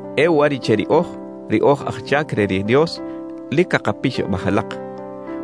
E uwariꞌche riꞌoj, ri oj aj chac re ri Dios, lic cakapixabaj alak: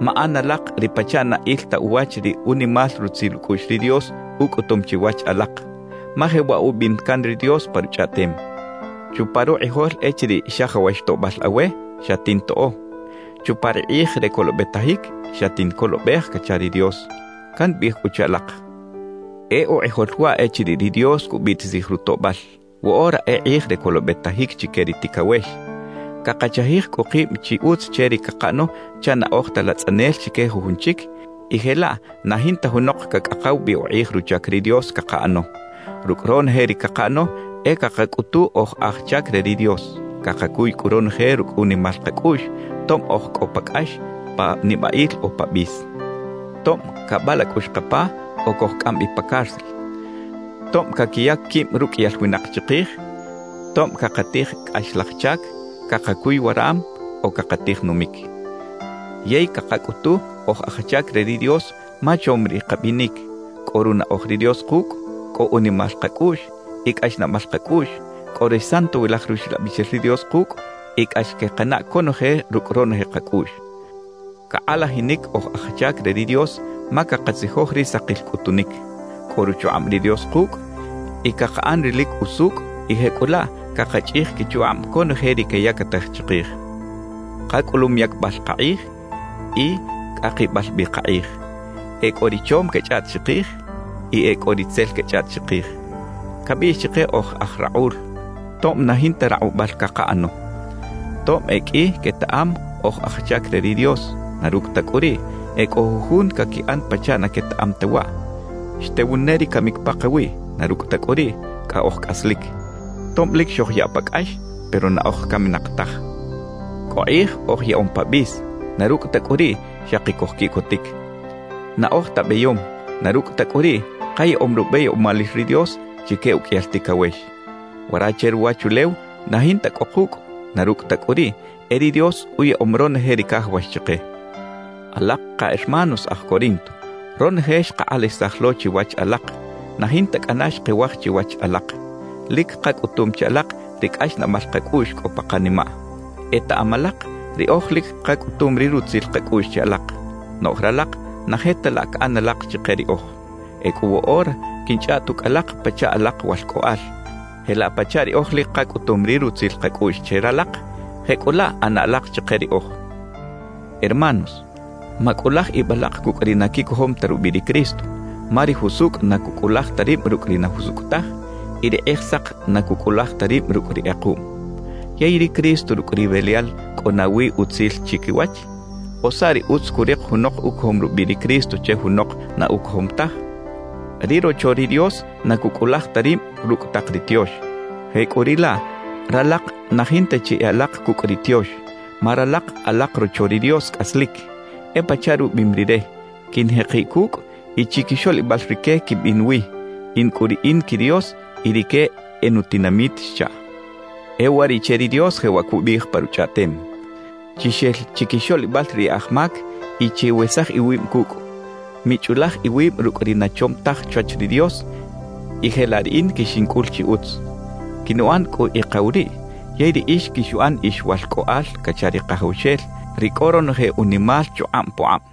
Maꞌan alak ri pachaꞌ na il ta uwach ri unimal rutzil ucꞌuꞌx ri Dios ucꞌutum chiwach alak. Ma jewaꞌ ubiꞌim can ri Dios pa Ruchꞌaꞌtem: Chupa rukꞌijol echiriꞌ xajawax toꞌbal awe, xatintoꞌo; Chupa ri kꞌij re colobetajic, xatincolobej cacha ri Dios. Cambiꞌij cꞌu che alak: E ukꞌijol waꞌ echiriꞌ ri Dios cubiꞌtisij rutoꞌbal; woꞌora e kꞌij re colobetajic chique ri ticawex. Cakachajij cꞌu kib chi utz che ri cakaꞌano chaꞌ na oj ta latzꞌanel chique jujun chic y jelaꞌ na jinta junok cacꞌakaw bi ukꞌij ruchac ri Dios cakaꞌano. Rucꞌ ronoje ri cakaꞌano e cakacꞌutu oj aj chac re ri Dios. Cakacuy cꞌu ronoje rucꞌ unimal kacꞌuꞌx, tob oj cꞌo pa cꞌax, pa nibaꞌil o pa bis; tob cabalacꞌux kapa o cojcꞌam bi pa cárcel, tob caquiyac quib ruqꞌuiyal winak chikij; tob cakatij cꞌaxlaj chac, cakacuy waram o cakatij numic. Yey cakacꞌutu oj aj chac re ri Dios ma chom ri kabinic, cꞌo runaꞌoj ri Dios kucꞌ, cꞌo unimal kacꞌuꞌx y cꞌaxnaꞌbal kacꞌuꞌx, cꞌo ri Santowilaj Ruxlabixel ri Dios kucꞌ y cꞌax quekanaꞌ conoje rucꞌ ronoje kacꞌuꞌx. Cakꞌalajinic oj aj chac re ri Dios ma cakatzijoj ri sakil cꞌutunic, cꞌo ruchukꞌab ri Dios kucꞌ y cakaꞌan ri lic usucꞌ y jecꞌulaꞌ cakachꞌij quichukꞌab conoje ri queyactaj chikij. Kacꞌulum yacbal kakꞌij y cꞌakibal bi kakꞌij; e cꞌo ri chom quechꞌaꞌt chikij y e cꞌo ri tzel quechꞌaꞌt chikij. Cabiꞌx chike oj aj rakꞌul, tob na jinta rakꞌubal cakaꞌano. Tob e qꞌui quetaꞌam oj aj chac re ri Dios; na rucꞌ ta cꞌu riꞌ, e cꞌo jujun caquiꞌan pachaꞌ na quetaꞌam ta waꞌ. Xtewun ne ri camic pakawiꞌ; na rucꞌ ta cꞌu riꞌ, cꞌa oj cꞌaslic. Tob lic xojyaꞌ pa cꞌax, pero na oj caminak taj. Cꞌo kꞌij oj yaꞌom pa bis; na rucꞌ ta cꞌu riꞌ, xaki cojquiꞌcotic. Na oj ta beyom; na rucꞌ ta cꞌu riꞌ, kayaꞌom rubeyomalil ri Dios chique uqꞌuiyal ticawex. Wara che ruwachulew na jinta cꞌo kucꞌ; na rucꞌ ta cꞌu riꞌ, e ri Dios uyaꞌom ronoje ri cajawax chike. Alak ka hermanos aj Corinto, ronoje xkakꞌalajisaj lo chiwach alak, na jinta cꞌana xkewaj chiwach alak. Lic kacꞌutum che alak ri cꞌaxnaꞌbal kacꞌuꞌx cꞌo pa kanimaꞌ. Etaꞌam alak riꞌoj lic kacꞌutum ri rutzil kacꞌuꞌx che alak, noꞌj ralak na je ta laꞌ caꞌan alak chike riꞌoj. Ecꞌu woꞌora quinchꞌaꞌt ucꞌ alak pachaꞌ alak walcꞌoꞌal: Jelaꞌ pachaꞌ riꞌoj lic kacꞌutum ri rutzil kacꞌuꞌx che ralak, jecꞌulaꞌ ꞌana alak chike riꞌoj. Hermanos, macꞌulaj ib alak cucꞌ ri na quicojom ta rubiꞌ ri Cristo, ma ri jusucꞌ na cucꞌulaj ta rib rucꞌ ri na jusucꞌ taj y ri kꞌijsak na cucꞌulaj ta rib rucꞌ ri kꞌekuꞌm. ¿Yey ri Cristo rucꞌ ri Belial cꞌo nawi utzil chiquiwach? ¿O saꞌ ri utz curik junok ucojom rubiꞌ ri Cristo che junok na ucojom taj? Ri rocho ri Dios na cucꞌulaj ta rib rucꞌ tak ri tiox. Jecꞌuriꞌlaꞌ ralak na jinta chi e alak cucꞌ ri tiox, ma ralak alak rocho ri Dios cꞌaslic. E pachaꞌ rubiꞌim Rire: Quinjekiꞌ cucꞌ y chiquixoꞌlibal rique quimbin wi. In cꞌu Riꞌin qui Dios y rique e nutinamit xchaꞌ. E uwariꞌche ri Dios jewaꞌ cubiꞌij pa Ruchꞌaꞌtem: Chixel chiquixoꞌlibal ri e aj mac y chiwesaj iwib cucꞌ. Michꞌulaj iwib rucꞌ ri na chom taj chwach ri Dios, y jelaꞌ Riꞌin quixincꞌul chi utz. Quinuꞌan cꞌu Ikaw riꞌ, yey riꞌix quixuꞌan ix walcꞌoꞌal cacha ri Kajawxel, ri cꞌo ronoje unimal chukꞌab pukꞌab.